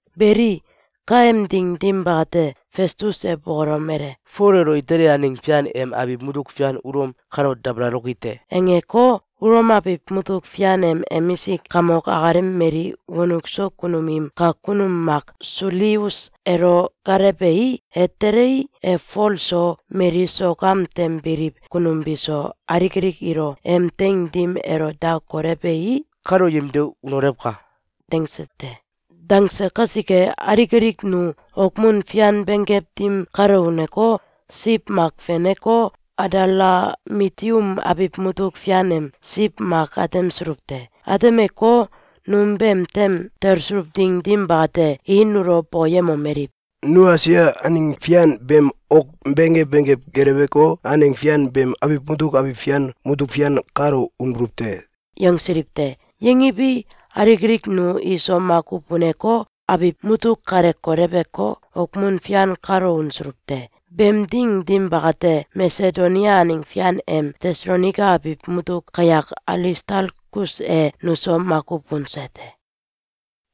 Beli, kaem ding dim bakate, Festus e bokolomele: “Fol elo Itali aneng fian em abiw mutuk fian Ulom kalo dabaloki te!”, angeko, Ulom abiw mutuk fian em emisik kamok akalem mali wonuk so kunum im kak kunum mak Sulius elo gaalewei, e telei, e Fol so, mali sok am tem biliw kunum biso, alik alik ilo em teing dim elo da kolewei, “Kalo yemde unolewka!”, dangse te. Dangse kasike, alik alik nu okmun fian benggew dim kalo uneko, siw mak feneko, Adalamitium abiw mutuk fian em siw mak atemsuluw te. Atemeko, num beem tem talsuluw ding dim bakate, i nulo bokoyemomeliw: “Nu Esia aneng fian beem ok benggew benggew geleweko, aneng fian beem abiw mutuk abiw fian mutuk fian kalo unbuluw te!”, yangsiliw te. Yangiwi, alik alik nu iso makuw uneko, abiw mutuk kale koleweko, okmun fian kalo unsuluw te. Beem ding dim bakate, Masedonia aneng fian em Tesalonaika abiw mutuk kayak Alistalkus e nuso makuw unse te.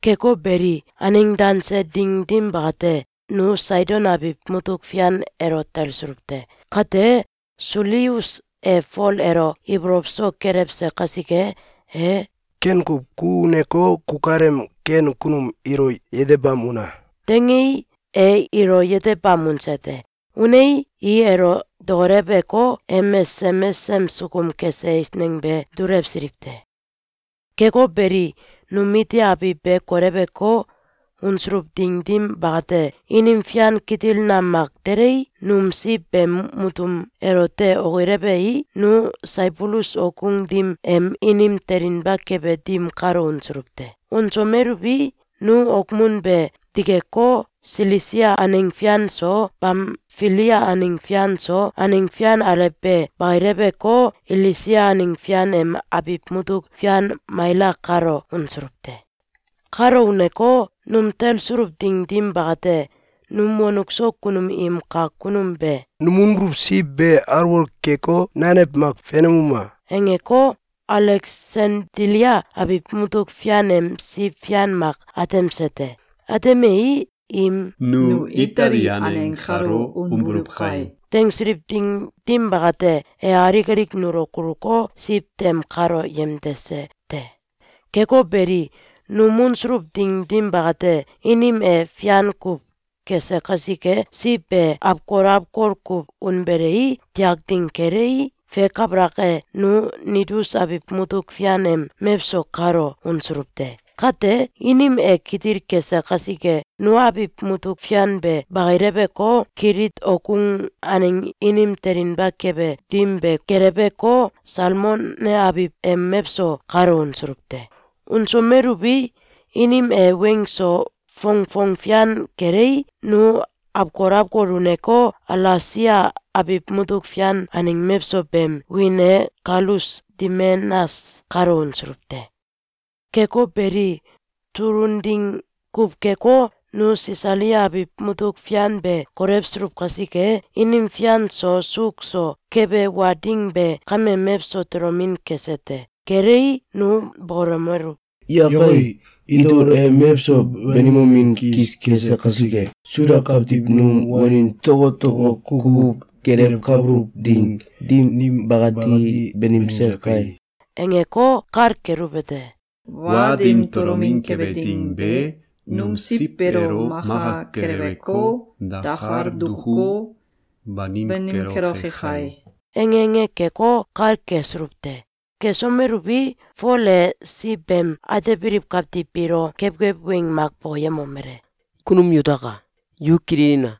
Keko beli, aneng danse ding dim bakate, nu Saidon abiw mutuk fian elo talsuluw te. Kate, Sulius e Fol elo ibolow so kelewse kasike, e “Ken kuw! Ku uneko, kukalem ken kunum ilo yetebam una!”, dangei, e ilo yetebam unse te. Unei, i elo dokoleweko, em mesesem mesesem sukum kese eisneng be dulewsiliw te. Keko beli, num iti abiw be koleweko, unsuluw ding dim bakate, inim fian kitil nam mak telei, num siw beem mutum elote okilewei, nu Saibulus okgung dim em inim telinba kebe dim kalo unsuluw te. Unsomeluwi, nu okmun be dikeko, Silisia aneng fian so, Bamfilia aneng fian so, aneng fian alew be bakileweko, Ilisia aneng fian em abiw mutuk fian Maila kalo unsuluw te. Kalo uneko, num talsuluw ding dim bakate, num wonuk so kunum im kak kunum be “Num unbuluw siw be alwol keko, nanew mak fenemuma!”, angeko, Aleksandilia abiw mutuk fian em siw fian mak atemse te. Atemei, im “Nu Itali aneng kalo unbuluw kai!”, dangsiliw ding dim bakate, e alik alik nulo kuluko, siw tem kalo yemdese te. Keko beli, num unsuluw ding dim bakate, inim e fian kuw kese kasike, siw be awkol awkol kuw unbelei, tiak ding kelei, fe kabalak e, nu Nidus abiw mutuk fian em mewso kalo unsuluw te. Kate, inim e kitil kese kasike, nu abiw mutuk fian be bakileweko, Kilit okgung aneng inim telinba kebe dim be geleweko, Salmone abiw em mewso kalo unsuluw te. Unsomeluwi, inim e weng so fongfong fian kelei, nu awkol awkol uneko, Alasea abiw mutuk fian aneng mewso beem wiin e Kalus Dimenas kalo unsuluw te. Keko beli, tulun ding kuw keko, nu Sisalia abiw mutuk fian be kolewsuluw kasike, inim fian so suuk so kebe wa ding be kame mewso tolomin kese te. Kelei, nu bokolomeluw: “Yakai! Itol e mewso banimomin kis kese kasike, Suda kawtiw num wanin tokotoko kukuw gelewkabuluw ding dim bakati banimse kai!”, angeko, kal keluwete: “Wa dim tolomin kebe ding be num siw beelo maka keleweko, dakal dukuko, banim keloke kai!”, ange ange keko, kal kesuluw te. Kesomeluwi, Fol e siw beem atebiliw kawtiw biilo kewkew weng mak bokoyemomele: “Kunum yutaka! Yu kililina!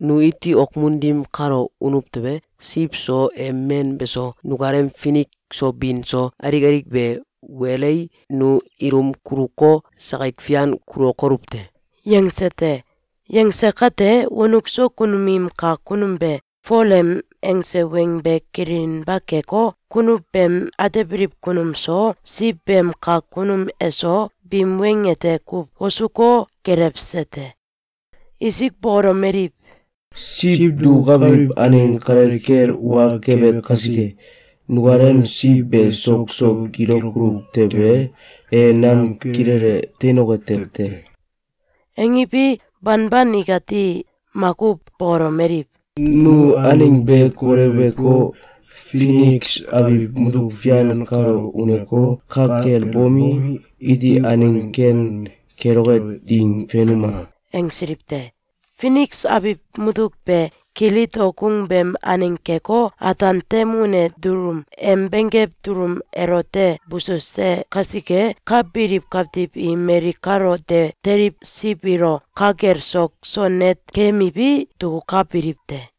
Nu iti okmun dim kalo unuw tewe, siw so, em men beso, nukalem finik so bin so, alik alik be walei, nu ilum kuluko, sakik fian kulokoluw te.”, yangse te. Yangse kate, wonuk so kunum im kak kunum be Fol em angse weng be kililinba keko, kunuw beem atebiliw kunum so, siw beem kak kunum eso, biim weng ete kuw wosuko, gelewse te. Isik bokolomeliw: “Siw dukukabiliw aneng kale kel wa kebe kasike, nukalem siw be sok so gilokoluw tewe, e nam kilele teinoke tew te.”, angiwi, banban ikati makuw bokolomeliw: “Nu aneng be koleweko, Finiks abiw mutuk fian kalo uneko, ka kel bomi, iti aneng ken keloke ding fenuma!”, angsiliw te. Finiks abiw mutuk be, Kilit okgung beem aneng keko, ataan tem une dulum em benggew dulum elote bususe kasike, ka biliw kawtiw i mali kalo de teliw siw ilo ka kel sok so net keyemiwi, dukukabiliw te.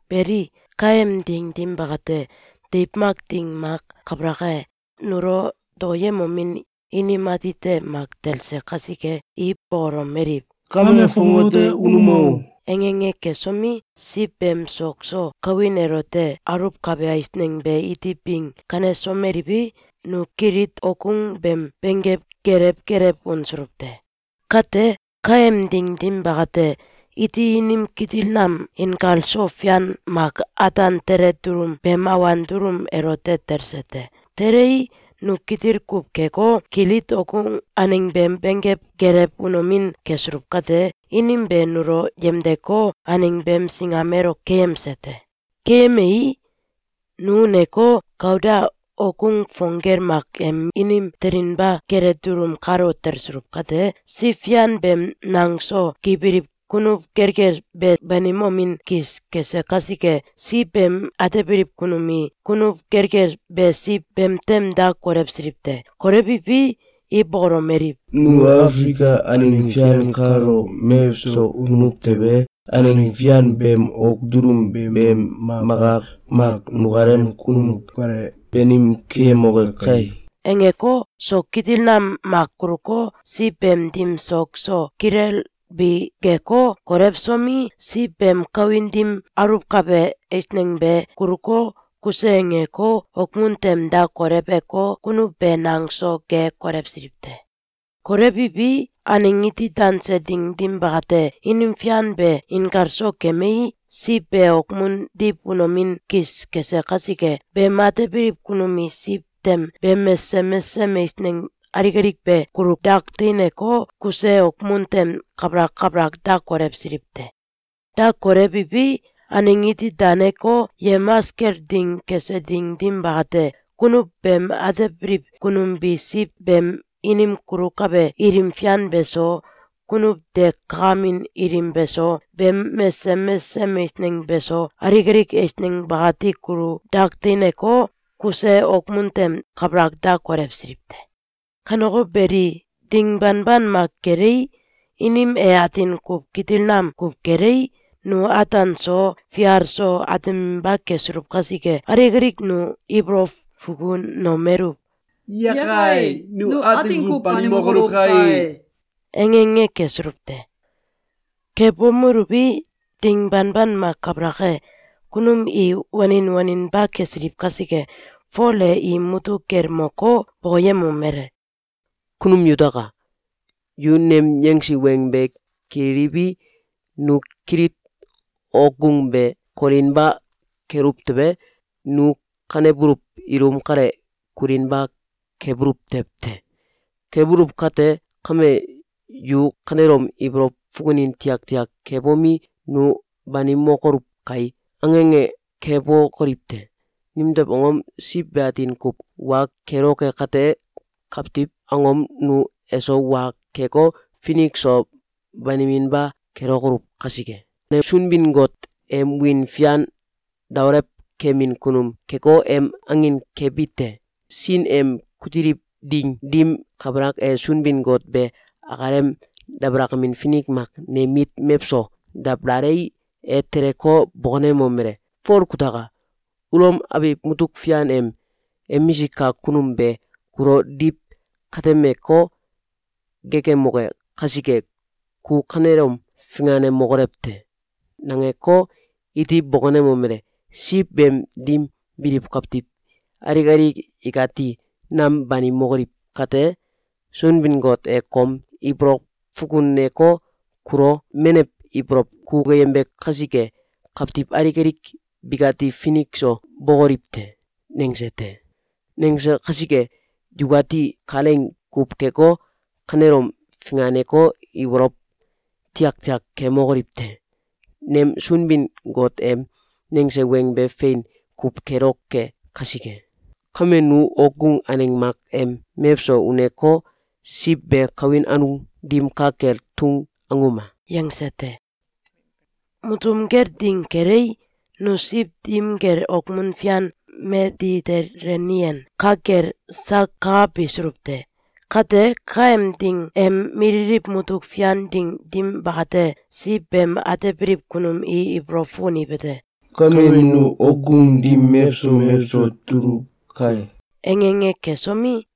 Beli, kaem ding dim bakate, deiw mak ding mak kabalak e, nulo dokoyemomin inim atite mak talse kasike, i bokolomeliw: “Kame fongate unuma o!”, ange ange kesomi, siw beem sok so kawin elote aluwkabe eisneng be iti bing kanesomeliwi, nu Kilit okgung beem benggew gelew gelew unsuluw te. Kate, kaem ding dim bakate, iti inim kitil nam inkalso fian mak ataan tele dulum beem awan dulum elote talse te. Telei, nu kitil kuw keko, Kilit okgung aneng beem benggew gelew unomin kesuluw kate, inim be nulo yemdeko, aneng beem singam elo keyemse te. Keyemei, nu uneko, Kauda okgung fong gel mak em inim telinba kele dulum kalo talsuluw kate, siw fian beem nang so gibiliw kunuw gelgel be banimomin kis kese kasike, siw beem atebiliw kunum i kunuw gelgel be siw beem tem da kolewsiliw te. Kolewiwi, i bokolomeliw: “Nu Afilika aneng fian kalo mewso unuw tewe, aneng fian beem ok dulum beem maka mak nukalem kunuw kale banim keyemoke kai!”, angeko, sok kitil nam mak kuluko, siw beem dim sok so kilelbi geko, kolewsomi, siw beem kawin dim aluwkabe eisneng be kuluko, kuse angeko, okmun tem da kolewko, kunuw be nang so ge kolewsiliw te. Kolewiwi, aneng iti danse ding dim bakate, inim fian be inkalso kemei, siw be okmun diw unomin kis kese kasike, beem atebiliw kunum i siw tem beem mesesem mesesem eisneng alik alik be kulu dak teineko, kuse okmun tem kabalak kabalak da kolewsiliw te. Da kolewiwi, aneng iti daneko, yemamas kel ding kese ding dim bakate, kunuw beem atebiliw kunum bi siw beem inim kulukabe ilim fian beso, kunuw de kakamin ilim beso, beem mesesem mesesem eisneng beso, alik alik eisneng bakati kulu dak teineko, kuse okmun tem kabalak da kolewsiliw te. Kaneko beli, ding banban mak kelei, inim e atin kuw kitil nam kuw kelei, nu ataan so, fial so, ateminba kesuluw kasike, alik alik nu ibolow fukunomeluw: “Yakai! Nu atin kuw banimokoluw kai!”, ange ange kesuluw te. Kebomuluwi, ding banban mak kabalak e, kunum i wanin waninba kesiliw kasike, Fol e im mutuk kel moko, bokoyemomele: “Kunum yutaka! Yu nem yangsi weng be kililiwi, nu Kilit okgung be kolinba keluw tewe, nu kanebuluw ilum kale kulinba kebuluw tew te. Kebuluw kate kame, yu kanelom ibolow fukunin tiaktiak kebomi, ‘Nu banimokoluw kai!’, ange ange kebokoliw te! Nimtew angom? Siw be atin kuw wa keloke kate, kawtiw angom nu eso wa keko, finik so baniminba kelokoluw kasike. Ne Sunbin-Got em wiin fian daolewkemin kunum keko, em angin kebi te. Sin em kutiliw ding dim kabalak e, Sunbin-Got be akalem dabalakamin finik mak nem mit mewso dabalalei, e teleko, bokonemomele: ‘Fol, kutaka! Ulom abiw mutuk fian em emisik kak kunum be kulo diw katemeko, geekemoke kasike, ku kanelom finganemokolew te!’, nangeko, iti bokonemomele: Siw beem dim biliw kawtiw alik alik ikati nam banimokoliw kate, Sunbin-Got e kom ibolow fukuneko, kulo menew ibolow kukuyembe kasike, kawtiw alik alik bikati finik so bokoliw te.’, nangse te. Nangse kasike, yukati kalaing kuw keko, kanelom finganeko, ibolow tiaktiak kemokoliw te! Nem Sunbin-Got em nangese weng be fein kuw keloke kasike. Kame, nu okgung aneng mak em mewso uneko, siw be kawin anung dim ka kel tung anguma!”, yangse te. Mutum kel ding kelei, nu siw dim kel okmun fian Meditelenian ka kel sak kakabisuluw te. Kate, kaem ding em mililiw mutuk fian ding dim bakate, siw beem atebiliw kunum i ibolow fukuniwete: “Kame nu okgung dim mewso mewso tuluw kai!”, ange ange kesomi,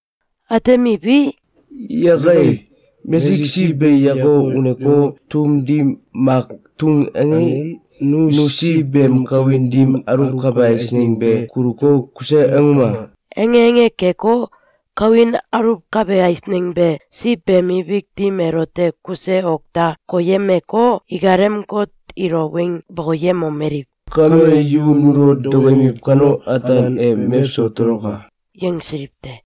Atemiwi, “Yakai! Mesik siw be yako uneko, tum dim mak tung angei, nu siw beem kawin dim aluwkabe eisneng be kuluko, kuse anguma!”, ange ange keko, kawin aluwkabe eisneng be siw beem ibik dim elote kuse ok da koyemeko, ikalem got ilo weng bokoyemomeliw: “Kame yu nulo dokoyemiw kano, ataan e mewso toloka!”, yangsiliw te.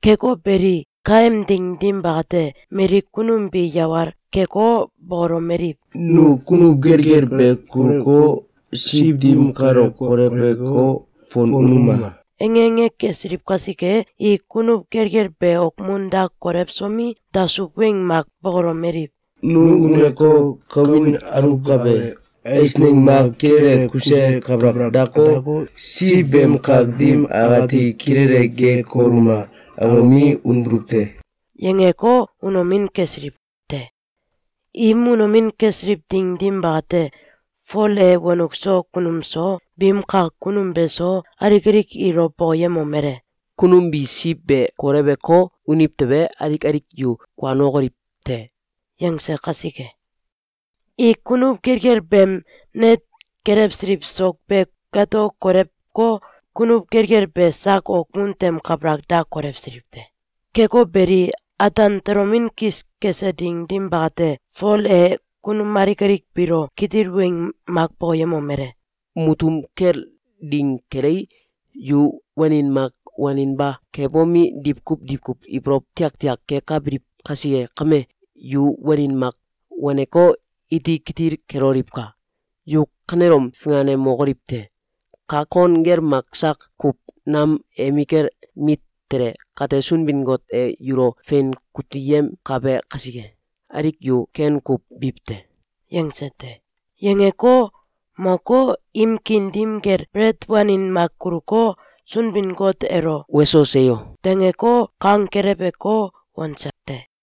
Keko beli, kaem ding dim bakate, mali kunum bi yawal keko, bokolomeliw: “Nu kunuw gelgel be kuluko, siw dim kale koleweko, fon unuma!”, ange ange kesiliw kasike, i kunuw gelgel be okmun da kolewsomi, dasuw weng mak bokolomeliw: “Nu uneko, ‘Kawin aluwkabe eisneng mak kilele kuse kabalak dako, siw beem kak dim akati kilele ge koluma!’, angomi, unbuluw te.”, yangeko, unomin kesiliw te. Im unomin kesiliw ding dim bakate, Fol e wonuk so kunum so, biim kak kunum beso, alik alik ilo bokoyemomele: “Kunum bi siw be koleweko, uniw tewe, alik alik yu kuanokoliw te.”, yangse kasike, i kunuw gelgel beem net kelewsiliw sok be gato koleweko, kunuw gelgel be sak okmun tem kabalak da kolewsiliw te. Keko beli, ataan tolomin kis kese ding dim bakate, Fol e kunum alik alik biilo kitil weng mak bokoyemomele: “Mutum kel ding kelei, yu wanin mak waninba kebomi, diwkuw diwkuw ibolow tiaktiak kekabiliw kasike kame, yu wanin mak waneko, iti kitil keloliwka! Yu kanelom finganemokoliw te! Kak kon gel mak sak kuw nam emikel mit tele kate, Sunbin-Got e yulo fein kuteyemkabe kasike, alik yu ken kuw biw te.”, yangse te. Yangeko, moko, im kiin dim kel belet wanin mak kuluko, Sunbin-Got elo “Weso, seyo!”, dangeko, kang keleweko, wanse te.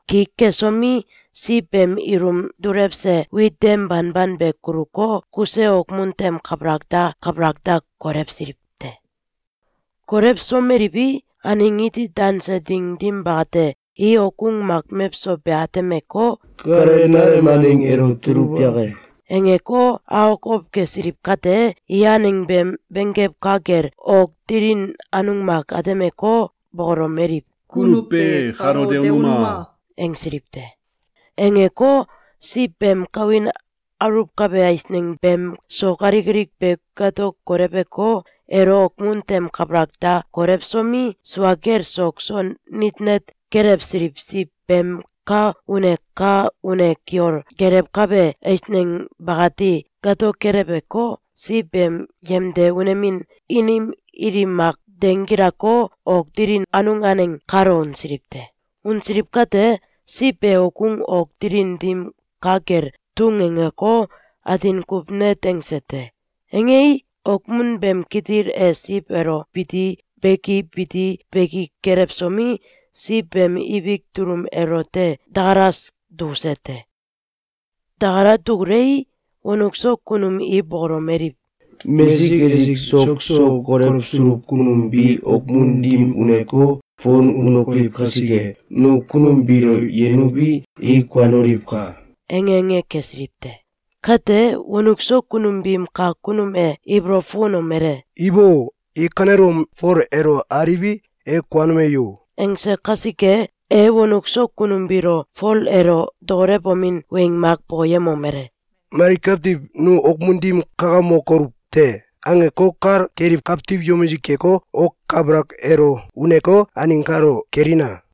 ki kesomi, siw beem ilum dulewse wit dem banban be kuluko, kuse okmun tem kabalak da kabalak da kolewsiliw te. Kolewsomeliwi, aneng iti danse ding dim bakate, i okgung mak mewso be atemeko, “Kale nalem aneng elo tuluw yake?”, angeko, akokow kesiliw kate, i aneng beem benggew ka kel, ok dilin anung mak atemeko, bokolomeliw: “Kunuw be kalo de unuma!”, angsiliw te. Angeko, siw beem kawin aluwkabe eisneng beem sok alik alik be gato koleweko, elo okmun tem kabalak da kolewsomi, sua kel sok so nit net kelewsiliw siw beem ka une ka une kiol kelewkabe eisneng bakati gato keleweko, siw beem yemde unemin inim ilim mak denggilako, ok dilin anung aneng kalo unsiliw te. Unsiliw kate, siw be okgung ok dilin dim ka kel tung angeko, atin kuw net angse te. Angei, okmun beem kitil e siw elo biti beki biti beki kelewsomi, siw beem ibik dulum elote dakalas dukuse te. Dakala dukulei, wonuk so kunum i bokolomeliw: “Mesik esik sok so kolewsuluw kunum bi okmun dim uneko, fon unokoliw kasike, nu kunum biilo yenuwi, i kuanoliwka!”, ange ange kesiliw te. Kate, wonuk so kunum biim kak kunum e ibolow fukunomele: “Ibo! I kanelom Fol elo aliwi, e kuanome yo!”, angse kasike, e wonuk so kunum biilo Fol elo dokolewomin weng mak bokoyemomele: “Mali kawtiw ‘Nu okmun dim kakamokoluw te!’, angeko, kal keliw kawtiw yomisik keko, ok kabalak elo uneko, aneng kalo kelina!